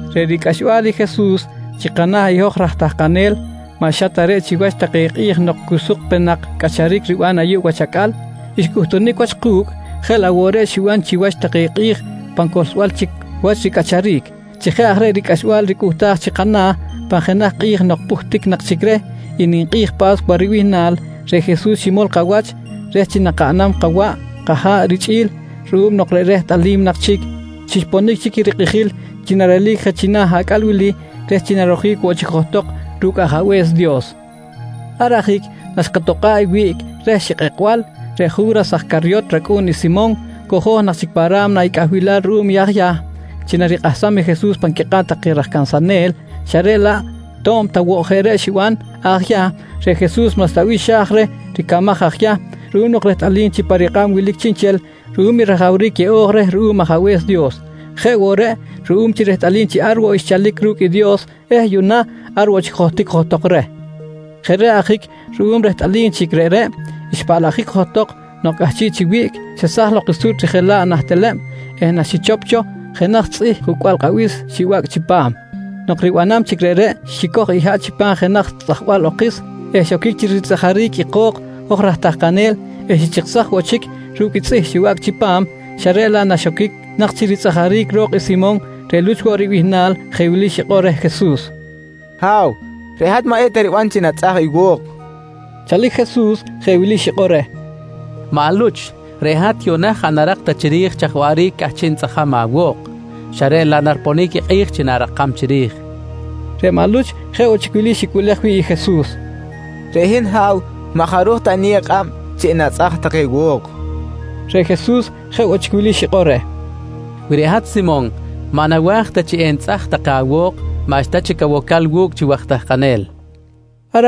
Reꞌ ricꞌaxbal i Jesus chi kana̱ i hoj raj tahkanel maꞌ xa ta reꞌ chiwach take kꞌi̱j nok cu suk pe nak cꞌacharic riban ayuꞌ wach acꞌal xcꞌuhtunic wach ku̱cꞌ jeꞌ laꞌ woꞌ reꞌ xiban chiwach take kꞌi̱j pan cohlsbal chic wach ricꞌacharic. Chi jeꞌ aj reꞌ ricꞌaxbal ricꞌuhtaj chi kana̱, pan jenaj kꞌi̱j nok pꞌuhtic nak chic reh i ninkꞌi̱j Pa̱scuwa ribihnal, reꞌ Jesus ximol kawach reh chi nakaꞌnam kawaꞌ kaha̱ꞌ richꞌi̱l ruꞌum nok rehtꞌalim nak chic chi xponic chic i rikꞌijil chi narelic je china̱ acꞌal wili reh chi narojic woꞌ chic johtok ru̱cꞌ Ajabe̱s Dios. Ar ajic naxkatokꞌa̱ꞌ i wiꞌc reh xikꞌekbal, reꞌ Ju̱ras aj Caryot racꞌu̱n i Simon cojo̱j nak chic pa ra̱mna i cꞌahbilal ruꞌum i aj Yahm, chi narikꞌahsam i Jesus pan quikꞌab take raj cansanel xa reꞌ laꞌ to̱b ta woꞌ jeꞌ reꞌ xiban aj Yahm, reꞌ Jesus maꞌxta bih xa̱j reh ricamaj aj Yahm ruꞌum nok rehtꞌalim chi pa rikꞌab wilic chiꞌnchel ruꞌum i rajawric yeꞌo̱j reh ruꞌum Ajabe̱s Dios. Jeꞌ woꞌ reꞌ ruꞌum chi rehtꞌalim chi ar woꞌ xchalic ru̱cꞌ i Dios eh yuꞌna ar woꞌ chic johtic johtok reh. Jeꞌ reꞌ ajic ruꞌum rehtꞌalim chic reꞌreꞌ, xpaꞌlajic johtok nok cꞌahchiꞌ chi wiꞌc, xesaj lok i suꞌt rijela̱ꞌ nah teleb eh naxichop cho jenaj tzꞌih jucꞌbal kꞌabis, xibacꞌ chipam. Nok ribanam chic reꞌreꞌ, xicoj i haꞌ chipam jenaj tzꞌajbal okis eh xoquic chi ritzꞌajaric i ko̱k hoj raj tahkanel eh xichiksaj woꞌ chic ru̱cꞌ i tzꞌih xibacꞌ chipam xa reꞌ laꞌ naxoquic nak chi ritzꞌajaric ro̱k i Simon reꞌ Luch woꞌ bihnal jeꞌ wili xikꞌor reh Jesus: «Ha̱w, reꞌ hat maꞌ eta riban chi enatzꞌaj i wo̱k, nqui reh. Chalic Jesus jeꞌ wili xikꞌor reh: «Maꞌ Luch, reꞌ hat yuꞌna jaꞌ narak ta chiri̱j chaj waꞌric cꞌahchiꞌ nitzꞌajam awo̱k xa reꞌ laꞌ nariponic i kꞌi̱j chi na̱rakam chiri̱j, nqui reh. Reꞌ maꞌ Luch jeꞌ woꞌ chic wili xicꞌuꞌlej wi̱ꞌ i Jesus: «Reꞌ hin Ha̱w, maꞌ jaruj ta eniyew kꞌab chi enatzꞌaj take wo̱k, nqui reh Jesus. Reꞌ Jesus jeꞌ woꞌ chic wili xikꞌor reh: «Wi reꞌ hat Simon maꞌ nawa̱j ta chi enitzꞌaj take awo̱k maꞌxta chic awocal wu̱cꞌ chi waj tahkanel, nqui reh.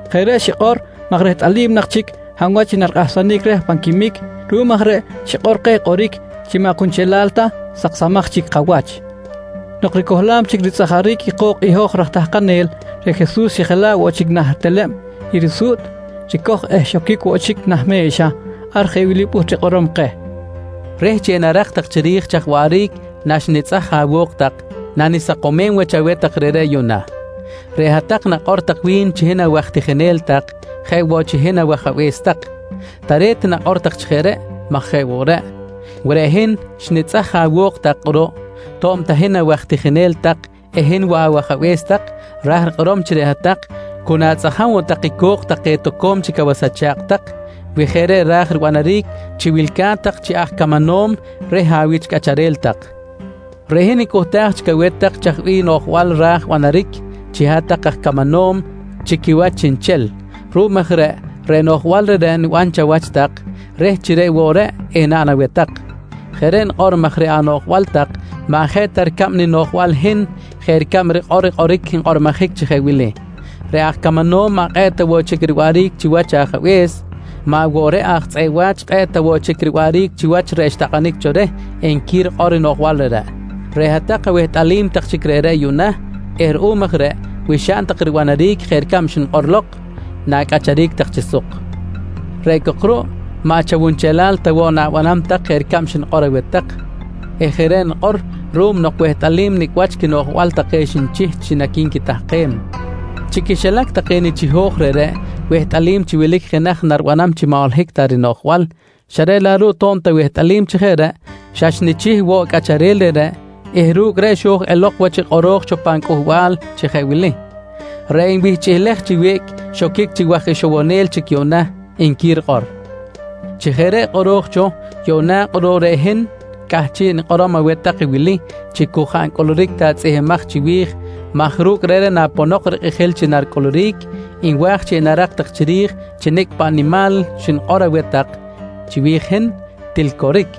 Jeꞌ reꞌ xikꞌor maj rehtꞌalim nak chic hab wach i narikꞌahsanic reh pan quimic. Ruꞌum aj reꞌ xikꞌor keh kꞌoric chi maꞌ kunchelal ta saksamaj chic kawach. Nok ricohlam chic ritzꞌajaric i ko̱k i hoj raj tahkanel, reꞌ Jesus xijela̱ꞌ woꞌ chic nah teleb i risuꞌt ricoj eh xoquic woꞌ chic nah me̱xa. Ar jeꞌ wili pꞌuht rikꞌorom keh: «Reh chi enarak tak chiri̱j chaj waꞌric naxnitzꞌaj awo̱k tak nanisakomem wach aweh tak reꞌreꞌ yuꞌna: Reꞌ hat-tak nakꞌor tak wi̱n chi hin awaj tijinel tak jeꞌ woꞌ chi hin awAjabe̱s tak. Tare̱t i nakꞌor tak chi jeꞌ reꞌ maj jeꞌ woꞌ reꞌ. Wi reꞌ hin xnitzꞌaj awo̱k hat-tak kꞌuruꞌ to̱b ta hin awaj tijinel tak eh hin woꞌ awAjabe̱s tak, ra̱j rikꞌorom chi reꞌ hat-tak cu natzꞌajam woꞌ tak i co̱k take toco̱m chic awas acha̱kꞌ tak wi jeꞌ reꞌ raj ribanaric chi wilca̱t tak chi aj camanom reh awich cꞌacharel tak. Reꞌ hin nicꞌuhtaj chic aweh tak chaj bih noꞌjbal ra̱j banaric chi hat-tak aj camanom chi quiwach chiꞌnchel. Ruꞌum aj reꞌ, reꞌ noꞌjbal reꞌreꞌ niban chawach tak reh chi reꞌ woꞌ reꞌ, enaꞌn aweh tak. Jeꞌ reꞌ nikꞌor maj reꞌ anoꞌjbal tak maꞌ jeꞌ ta ricab ninoꞌjbal i hin jeꞌ ricab rikꞌor i kꞌoric nkꞌormojic chi jeꞌ wili: “Reꞌ aj camanom maꞌ kꞌe̱ꞌ ta woꞌ chic riwaꞌric chiwach i ajabe̱s, maꞌ woꞌ reꞌ aj tzꞌeꞌ wa̱ch kꞌe̱ꞌ ta woꞌ chic riwaꞌric chiwach reꞌ xtakꞌanic cho reh nqui rikꞌor i noꞌjbal reꞌreꞌ. «Reꞌ hat-tak awehtꞌalim tak chic reꞌreꞌ yuꞌna eh ruꞌum aj reꞌ wi xaꞌn tak ribanaric jeꞌ ricab xnikꞌor lok, na̱cꞌacharic tak chi suk. Reꞌ cok ruꞌ maꞌ chawunchelal ta woꞌ na̱banam tak jeꞌ ricab xnikꞌor aweh tak eh jeꞌ reꞌ nikꞌor ruꞌum nok wehtꞌalim nicꞌ wach quinoꞌjbal take xnichih chi naqui̱nquitahkem. Chi quixilac take nichiho̱j reꞌreꞌ, wehtꞌalim chi wilic jenaj naribanam chi maꞌ holohic ta rinoꞌjbal xa reꞌ laꞌ ruꞌ to̱b ta wehtꞌalim chi jeꞌ reꞌ, xa xnichih woꞌ i cꞌacharel reꞌreꞌ eh ru̱cꞌ reꞌ xo̱j elok wach i kꞌoro̱j cho pan cꞌuhbal chi jeꞌ wili: “Reꞌ nwihchꞌilej chi wiꞌc xoquic chi waj ixowonel chic yuꞌna, nqui rikꞌor. «Chi jeꞌ reꞌ kꞌoro̱j cho yuꞌna kꞌuruꞌ reꞌ hin cꞌahchiꞌ nikꞌorom aweh tak wili chi cu jaꞌ ncꞌuluric ta i tzꞌihmbimaj chiwi̱j maj ru̱cꞌ reꞌreꞌ naponok rikꞌijil chi naricꞌuluric, nwa̱j chi enarak tak chiri̱j chi nicꞌ paꞌ nimal xnikꞌor aweh tak chiwi̱j i hin, til coric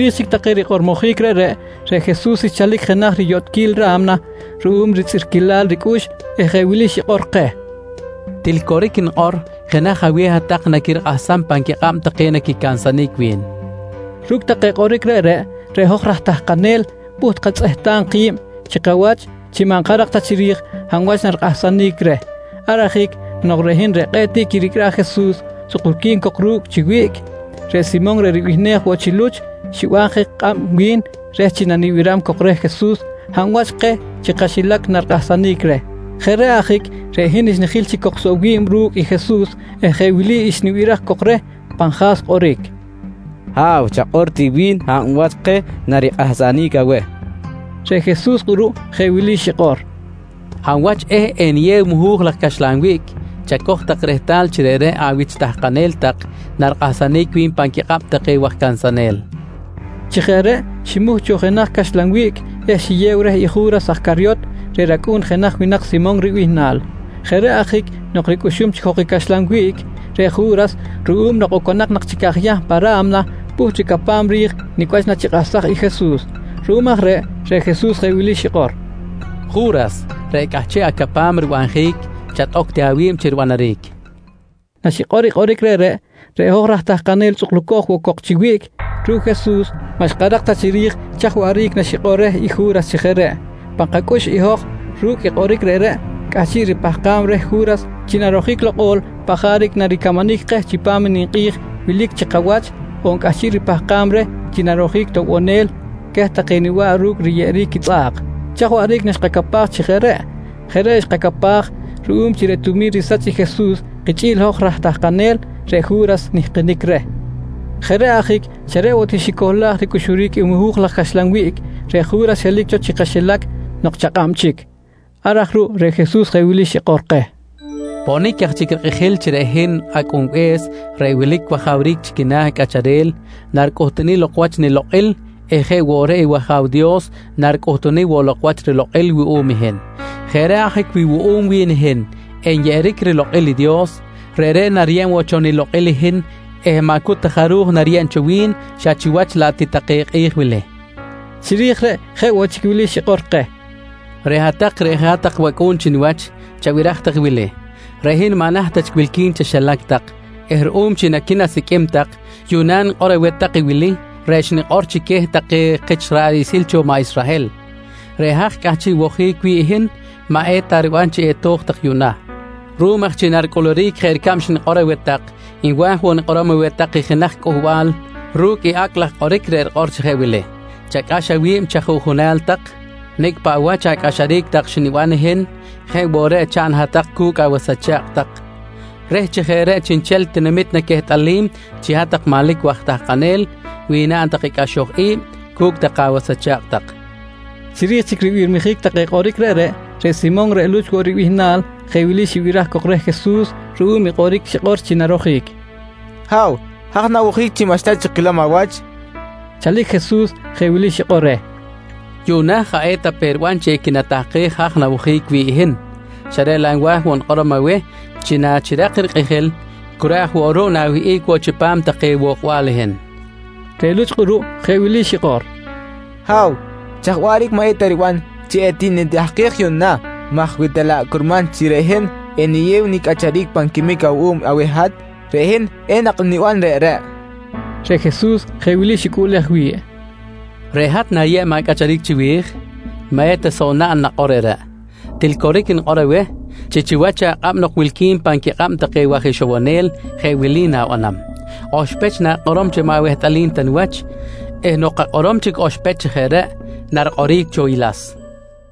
Chiri̱j chic take rikꞌormojic reꞌreꞌ, reꞌ Jesus xchalic jenaj riyotꞌquil ra̱mna ruꞌum ritzꞌirquilal ricꞌux eh jeꞌ wili xikꞌor keh: «Til coric nikꞌor, jenaj aweh hat-tak naquirikꞌahsam pan quikꞌab take naquicansanic wi̱n, nqui xikꞌor keh. Ru̱cꞌ take kꞌoric reꞌreꞌ, reꞌ hoj raj tahkanel pꞌuht katzꞌehtam ki̱b chi kawach chi maꞌ nkarak ta chiri̱j hab wach narikꞌahsanic reh. Ar ajic nok reꞌ hin reꞌ kꞌe̱ꞌ tiꞌ quiricꞌraj i Jesus tzꞌukulqui̱n cok ru̱cꞌ chi wiꞌc, reꞌ Simon reꞌ ribihnej woꞌ chi Luch, xiban je kꞌab wi̱n reh chi nanibiram cok reh Jesus hab wach keh chi kaxilac narikꞌahsanic reh. Jeꞌ reꞌ ajic reꞌ hin xnijil chic cok soꞌ wi̱b ru̱cꞌ i Jesus eh jeꞌ wili xnibiraj cok reh pan ja̱s kꞌoric: «Ha̱w, chakꞌor ti wi̱n hab wach keh narikꞌahsanic aweh? quinqui cok reh. Reꞌ Jesus kꞌuruꞌ jeꞌ wili xikꞌor: «Hab wach eh eniyew i muhu̱j laj caxlan wiꞌc, chacoj tak rehtal chi reꞌreꞌ awich tahkanel tak narikꞌahsanic wi̱n pan quikꞌab take waj cansanel, nqui keh. Chi jeꞌ reꞌ ximuh cho jenaj caxlan wiꞌc eh xiyew reh i Ju̱ras aj Caryot reꞌ racꞌu̱n jenaj winak Simon ribihnal. Jeꞌ reꞌ ajic nok ricꞌuxum chic jok i caxlan wiꞌc, reꞌ Ju̱ras ruꞌum nok oconak nak chic aj Yahm pa ra̱mna pꞌuht ricapam ri̱j nicꞌ wach nachikꞌahsaj i Jesus. Ruꞌum aj reꞌ, reꞌ Jesus jeꞌ wili xikꞌor: «Ju̱ras, reꞌ cꞌahchiꞌ acapam ribanjic chatꞌoc ti awi̱b chi ribanaric, nqui reh. Naxikꞌor i kꞌoric reꞌreꞌ, reꞌ hoj raj tahkanel tzꞌukulco̱j woꞌ cok chi wiꞌc ru̱cꞌ Jesus, maꞌ xkarak ta chiri̱j chaj waꞌric naxikꞌor reh i Ju̱ras chi jeꞌ reꞌ. Pan kacꞌux i hoj ru̱cꞌ i kꞌoric reꞌreꞌ, cꞌahchiꞌ ripahkam reh Ju̱ras chi narojic lokꞌol paꞌ jaric naricamanic keh chipam i ninkꞌi̱j wilic chi kawach on cꞌahchiꞌ ripahkam reh chi narojic toꞌbonel queh take niba̱ꞌ ru̱cꞌ riyeꞌeric quitzꞌa̱k. Chaj waꞌric naxkacapaj chi jeꞌ reꞌ? Jeꞌ reꞌ xkacapaj ruꞌum chi reꞌ tumi̱n risach i Jesus kichꞌi̱l hoj raj tahkanel, reꞌ Ju̱ras nihkinic reh. Jeꞌ reꞌ ajic xa reꞌ woꞌ ti xicohlaj ricꞌuxuric i muhu̱j laj caxlan wiꞌc, reꞌ Ju̱ras xelic cho chi kaxilac nok chakꞌab chic. Ar aj ruꞌ reꞌ Jesus jeꞌ wili xikꞌor keh: «Ponic aj chic rikꞌijil chi reꞌ hin Acꞌunbe̱s reꞌ wilic wajawric chi quina̱ cꞌacharel naricꞌuhtunic lok wach i nilokꞌil eh jeꞌ woꞌ reꞌ i wAja̱w Dios naricꞌuhtunic woꞌ lok rilokꞌil wuꞌum i hin. Jeꞌ reꞌ ajic wi wuꞌum wi̱n i hin nyeꞌeric rilokꞌil i Dios, reꞌreꞌ nariyeb woꞌ cho nilokꞌil i hin eh maꞌ cu ta jaruj nariyeb cho wi̱n xa chiwach laꞌ ti take kꞌi̱j wili, nqui keh. Chiri̱j reꞌ jeꞌ woꞌ chic wili xikꞌor keh: «Reꞌ hat-tak reꞌ jeꞌ hat-tak wacꞌu̱n chi niwach, chabiraj tak i wili: Reꞌ hin maꞌ naht ta chic wilqui̱n chaxilac tak eh ruꞌum chi naquinasiqꞌuim tak, yuꞌna nikꞌor woꞌ aweh tak i wili reꞌ xnikꞌor chic queh take kich ra̱ꞌ riꞌsil cho maꞌ Israhel: Reꞌ haj cꞌahchiꞌ wojic wi̱ꞌ i hin maꞌ eta riban chi eto̱j tak yuꞌna. Ruꞌum aj chi naricꞌuluric jeꞌ ricab xnikꞌor aweh tak, nwa̱j woꞌ nikꞌorom aweh tak i jenaj cꞌuhbal ru̱cꞌ i acꞌ laj kꞌoric reꞌ rikꞌor chi jeꞌ wili: Chacꞌax awi̱b chi ajuꞌjunal tak. Nicꞌ paꞌ wach acꞌaxaric tak xniban i hin jeꞌ woꞌ reꞌ chaꞌn hat-tak cu̱cꞌ awas acha̱kꞌ tak reh chi jeꞌ reꞌ chiꞌnchel tinamit naquehtꞌalim chi hat-tak manlic waj tahkanel wi naꞌn tak i cꞌaxoj i̱b cu̱cꞌ take awas acha̱kꞌ tak, nqui Jesus. Chiri̱j chic ribirmijic take kꞌoric reꞌreꞌ, reꞌ Simon reꞌ Luch woꞌ ribihnal jeꞌ wili xibiraj cok reh Jesus ruꞌum i kꞌoric xikꞌor chi narojic: «Ha̱w, haj na̱wojic chi maꞌxta chic kilom awach, nqui reh. Chalic Jesus jeꞌ wili xikꞌor reh: «Yuꞌna jaꞌ eta pe riban chi equinatahkej haj nawojic wi̱ꞌ i hin, xa reꞌ laꞌ nwa̱j woꞌ nikꞌorom aweh chi nachirak rikꞌijil cu reꞌ aj woꞌ ruꞌ na̱wiqꞌuic woꞌ chipam take wokbal i hin, nqui reh. Reꞌ Luch kꞌuruꞌ jeꞌ wili xikꞌor: «Ha̱w, chaj waꞌric maꞌ eta riban chi etinitahkej yuꞌna? maj wi ta laꞌ curman chi reꞌ hin eniyew nicꞌacharic pan quimic awuꞌum aweh hat, reꞌ hin enak niban reꞌreꞌ, nqui Luch. Reꞌ Jesus jeꞌ wili xicꞌuꞌlej wi̱ꞌ: «Reꞌ hat na̱yeb acꞌacharic chiwi̱j? Maꞌ eta soꞌ naꞌn nakꞌor reꞌreꞌ. Til coric nikꞌor aweh chi chiwach akꞌab nok wilqui̱n pan quikꞌab take waj ixowonel jeꞌ wili na̱banam: Oxpech na̱kꞌorom chi maꞌ awehtꞌalim ta niwach eh nok akꞌorom chic oxpech chi jeꞌ reꞌ, narikꞌoric cho i las, nqui Jesus.